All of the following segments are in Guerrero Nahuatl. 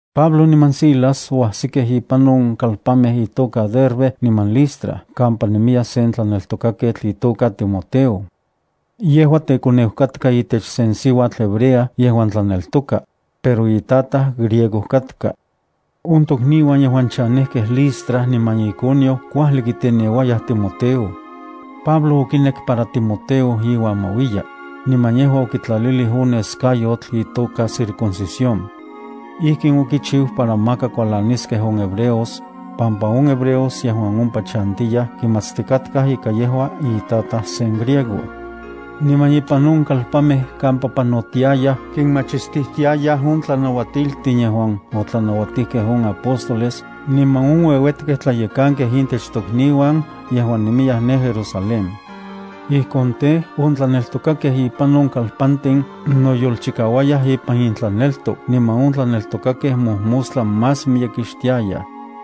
Pablo niman Silas oajsikej ipan on kalpanmej itoka Derbe niman Listra kampa nemiya sen tlaneltokaketl itoka Timoteo. Yejua tekoneu katka itech se siuatl hebrea yejuan tlaneltoka, pero itataj griego katka. On tokniuan yejuan chanejkej Listra niman Iconio kuajli kiteneuayaj Timoteo. Pablo okinek para Timoteo iuan ma uiya, niman yejua okitlalilij on neskayotl itoka circuncisión. Ijkin okichiu para maka kualaniskej on hebreos, pampa on hebreos yejuan ompa chantiyaj kimatstikatkaj ika yejua itataj sen griego. Niman ipan on kalpanmej kampa panotiayaj kinmachistijtiayaj on tlanauatiltin yejuan otlanauatijkej on apóstoles niman on ueuetkej tlayekankej itech tokniuan yejuan nemiyaj ne Jerusalén. Ijkon tej, on tlaneltokakej ipan on tiopantin noyolchikauayaj ipan intlaneltok niman on tlaneltokakej mojmostla más miyekixtiayaj.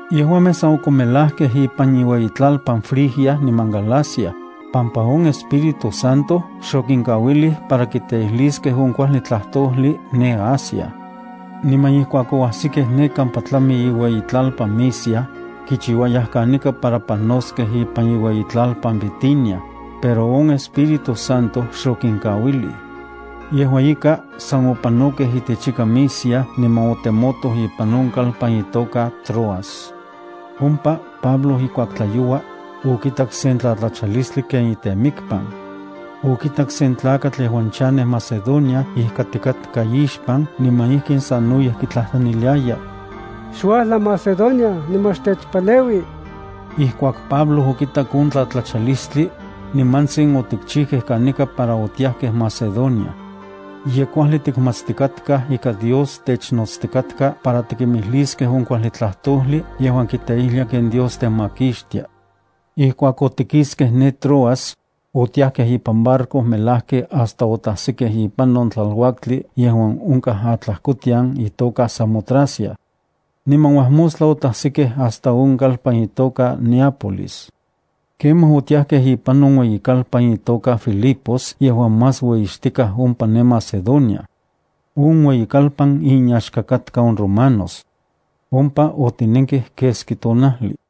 Yejuamej san okonmelajkej ipan inueyitlalpan Frigia niman Galacia, pampa on Espíritu Santo xokinkauilij para kiteijliskej on kuajli tlajtojli ne Asia. Niman ijkuak oajsikej ne kampa tlami iueyitlalpan Misia, kichiuayaj kanika para panoskej ipan iueyitlalpan Bitinia, pero on Espíritu Santo xokinkauilij. Yejua ika, san opanokej itechika Misia niman otemotoj ipan on kalpan itoka Troas. Ompa Pablo ijkuak tlayoua, okitak sen tlatlachalistli ken itemikpan. Okitak sen tlakatl yejuan chanej Macedonia ijkatikatka ixpan niman ijkin sanoyej kitlajtlaniliaya: “Xuajla Macedonia niman xtechpaleui.” Ijkuak Pablo okitak on tlatlachalistli, nimantsin otikchijkej kanika para otiajkej Macedonia. Ye kuajli tikmatstikatkaj ika Dios technotstikatka para tikimijliskej on kuajli tlajtojli yejuan kiteijlia ken Dios temakixtia. Ijkuak otikiskej de Troas, otiakej ipan barco melajki hasta otajsikej ipan on tlaluaktli yejuan onkaj atlajkotian itoka Samotracia. Niman uajmostla otajsikej hasta on kalpan itoka Neápolis. Kemaj otiajkej ipan on ueyikalpan itoka Filipos yejuan más ueyixtikaj ompa ne Macedonia. On ueyikalpan inyaxka katka on romanos. Ompa otinenkej keski tonajli.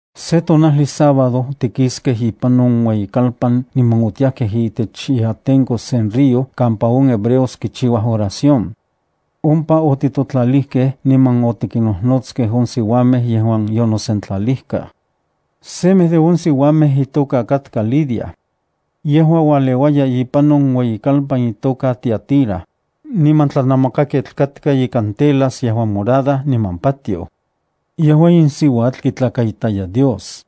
Se tonajli sábado otikiskej ipan on ueyikalpan niman otiajkej itech iatenko sen río kampa on hebreos kichiuaj oración. Ompa otijtotlalijkej niman otikinnojnotskej on siuamej yejuan yonosentlalijkaj. Semej de on siuamej itoka katka Lidia. Yejua ualeuaya ipan on ueyikalpan itoka Tiatira, niman tlanamakaketl katka ikan telas yejuan morada niman patioj. Yejua in siuatl kitlakaitaya Dios.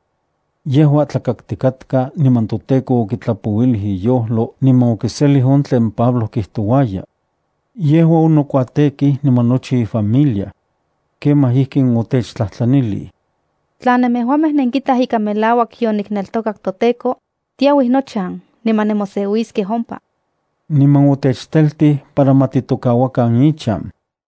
Yejua tlakaktikatka niman toTEKO okitlapouilij iyojlo niman okiselij on tlen Pablo kijtouaya. Yejua onokuatekij niman nochi ifamilia. Kemaj ijkin otechtlajtlanilij: —Tla nemejuamej nenkitaj ika melauak yonikneltokak toTEKO, tiauij nochan niman nemoseuiskej ompa. Niman otechteltij para ma titokauakan ichan.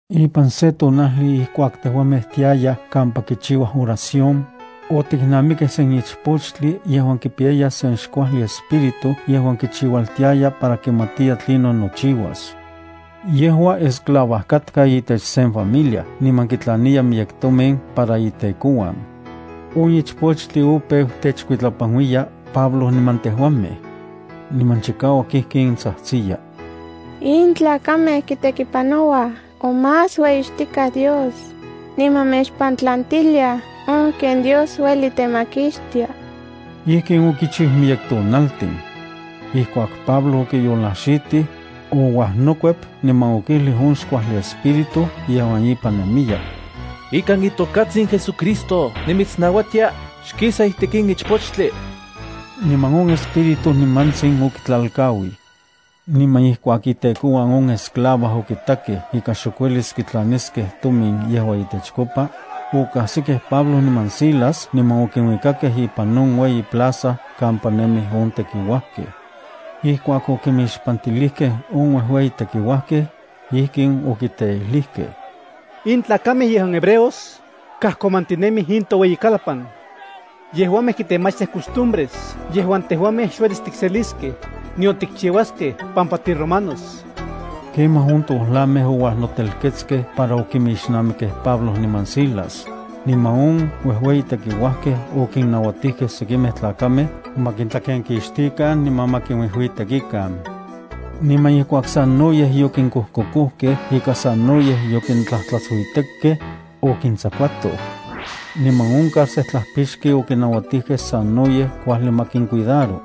Ipan se tonajli ijkuak tejuamej tiayaj kampa kichiuaj oración, otiknamikej sen ichpochtli yejuan kipiyaya sen xkuajli espíritu yejuan kichiualtiaya para kimatiya tlinon nochiuas. Yejua esclava katka itech sen familia niman kitlaniya miyek tomin para itekouan. On ichpochtli opeu techkuitlapanuiya Pablo niman tejuamej. Niman chikauak ijkin tsajtsiya: —In tlakamej kitekipanouaj on más ueyixtikaj Dios, niman mechpantlantiliaj on ken Dios ueli temakixtia. Ijkin okichiu miyek tonaltin. Ijkuak Pablo okiyolajxitij, ouajnokuep niman okijlij on xkuajli espíritu yejuan ipan nemiya: —Ikan itokatsin JesuCristo nimitsnauatia xkisa itech in ichpochtli. Niman on espíritu nimantsin okitlalkauij. Niman ijkuak itekouan on esclava okitakej ika xok uelis kitlaniskej tomin yejua itechkopa, okajsikej Pablo niman Silas niman okinuikakej ipan on ueyi plaza kampa nemij on tekiuajkej. Ijkuak okimixpantilijkej on uejueyi tekiuajkej, ijkin okiteijlijkej: —In tlakamej yejuan hebreos, kajkomantinemij in toueyikan. Yejuamej kitemachtiaj costumbres yejuan tejuamej xuelis tikseliskej, nion tikchiuaskej, pampa tiromanos. Kemaj on tojlamej ouajnotelketskej para okinmixnamikej Pablo niman Silas, niman on uejueyi tekiuajkej okinnauatijkej sekimej tlakamej ma kintlakenkixtikan niman ma kinuijuitekikan. Niman ijkuak sanoyej yokinkojkokojkej ika sanoyej yokintlajtlatsuitekkej, okintsakuatoj. Niman on carcejtlajpixki okinauatijkej sanoyej kuajli ma kincuidaro.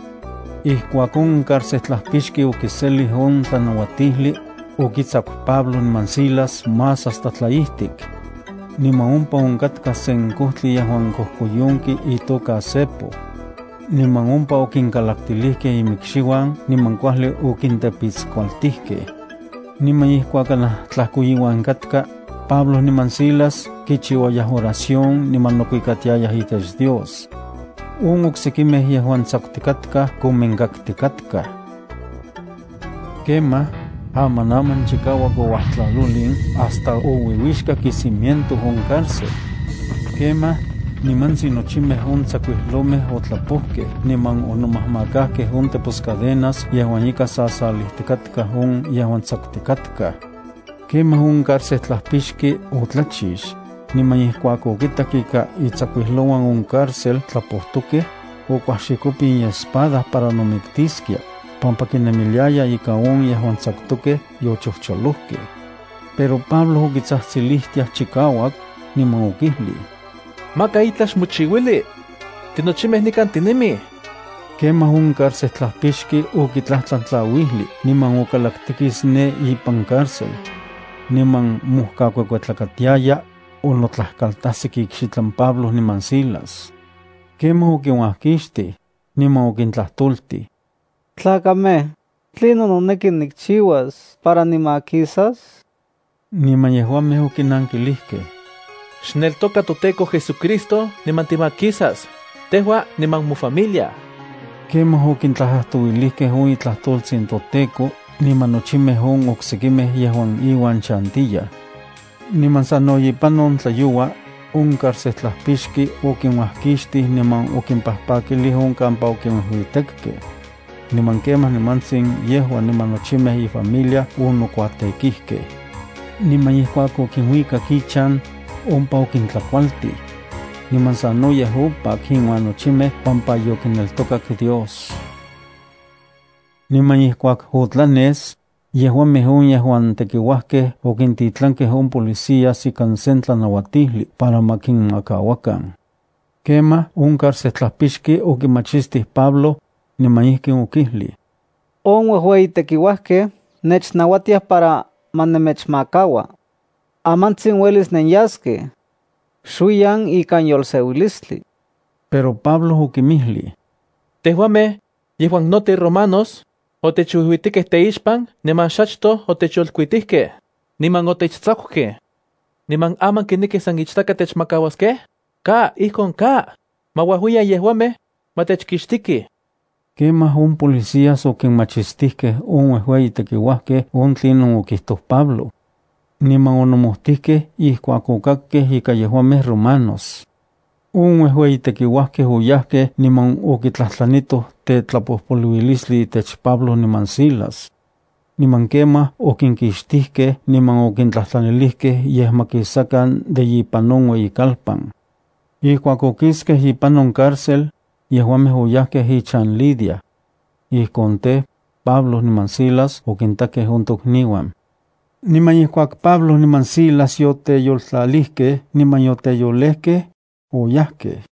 Ijkuak on carcejtlajpixki okiselij on tlanauatijli, okintsaku Pablo niman Silas más hasta tlaijtik. Niman ompa onkatka se kojtli yejuan kojkoyonki itoka cepo. Niman ompa okinkalaktilijkej imikxiuan niman kuajli okintepitskualtilijkej. Niman ijkuak kanaj tlajkoiuan katka, Pablo niman Silas kichiuayaj oración niman nokuitiayaj itech Dios. On oksekimej yejuan tsakutikatkaj kominkaktikatkaj. Kemaj, amanaman chikauak ouajtlalolin hasta ouiuixkak icimiento on cárcel. Kemaj, nimantsin nochimej on tsakuijlomej otlapojkej niman onomajmakajkej on teposcadenas yejuan ika sasalijtikatkaj on yejuan tsakutikatkaj. Kemaj on carcejtlajpixki otlachix, niman ijkuak okitak ika itsakuijlouan on cárcel tlapojtokej, okuajxikopin iespada para nomiktiskia, pampa kinemiliaya ija on yejuan tsakutokej yochojcholojkej. Pero Pablo okitsajtsilijtiaj chikauak, niman okijlij: —Maka itlaj xmochiuili. Tinochimej nikan tinemij. Kemaj on carcejtlajpixki okitlajtlan tlauijli, niman okalaktikis ne ipan cárcel. Niman mojkakuekuetlakatiaya, onotlajkaltajsik ikxitlan Pablo niman Silas. Kemaj okinuajkixtij, niman okintlajtoltij: —Tlakamej, ¿tlinon noneki nikchiuas para nimakisas? Niman yejuamej okinankilijkej: —Xneltoka toTEKO JesuCristo niman timakisas, tejua niman mofamilia. Kemaj okitlajtlajtouilijkej on itlajtoltsin toTEKO niman nochimej on oksekimej yejuan iuan chantiyaj. Niman sano ipan on tlayoua, on carcejtlajpixki okinuajkixtij niman okimpajpakilij on kampa okinuijuitekkej. Niman kemaj nimantsin yejua niman nochimej ifamilia onokuatekijkej. Niman ijkuak okinuikak ichan, ompa okintlakualtij. Niman sanoyej opak inuan nochimej pampa yokineltokak Dios. Niman ijkuak otlanes, yejuamej on yejuan tekiuajkej okintitlankej on policías ikan sen tlanauatijli para ma kinmakauakan. Kemaj, on carcejtlajpixki okimachistij Pablo, niman ijkin okijlij: —On uejueyi tekiuajkej nechnauatiaj para ma nemechmakaua. Amantsin uelis nenyaskej. Xuiyan ikan yolseuilistli. Pero Pablo okinmijlij: —Tejuamej, yejuan no tiromanos, otechuijuitekej teixpan niman xachtoj otechyolkuitijkej, niman otechtsakukej. ¿Niman aman kinekij san ichtaka techmakauaskej? ¡Ka, ijkon ka! Ma uajuiyan yejuamej, ma techkixtikij. Kemaj on policías okinmachistijkej on uejueyi tekiuajkej on tlinon okijtoj Pablo. Niman onomojtijkej ijkuak okakkej ika yejuamej romanos. On uejueyi tekiuajkej oyajkej niman okitlajtlanitoj tetlapojpoluilistli itech Pablo niman Silas. Niman kemaj okinkixtijkej niman okintlajtlanilijkej yej ma kisakan de ipan on ueyikalpan. Ijkuak okiskej ipan on cárcel, yejuamej oyajkej ichan Lidia. Ijkon tej, Pablo niman Silas okintakej on tokniuan. Niman ijkuak Pablo niman Silas yoteyoltlalijkej, oyajkej.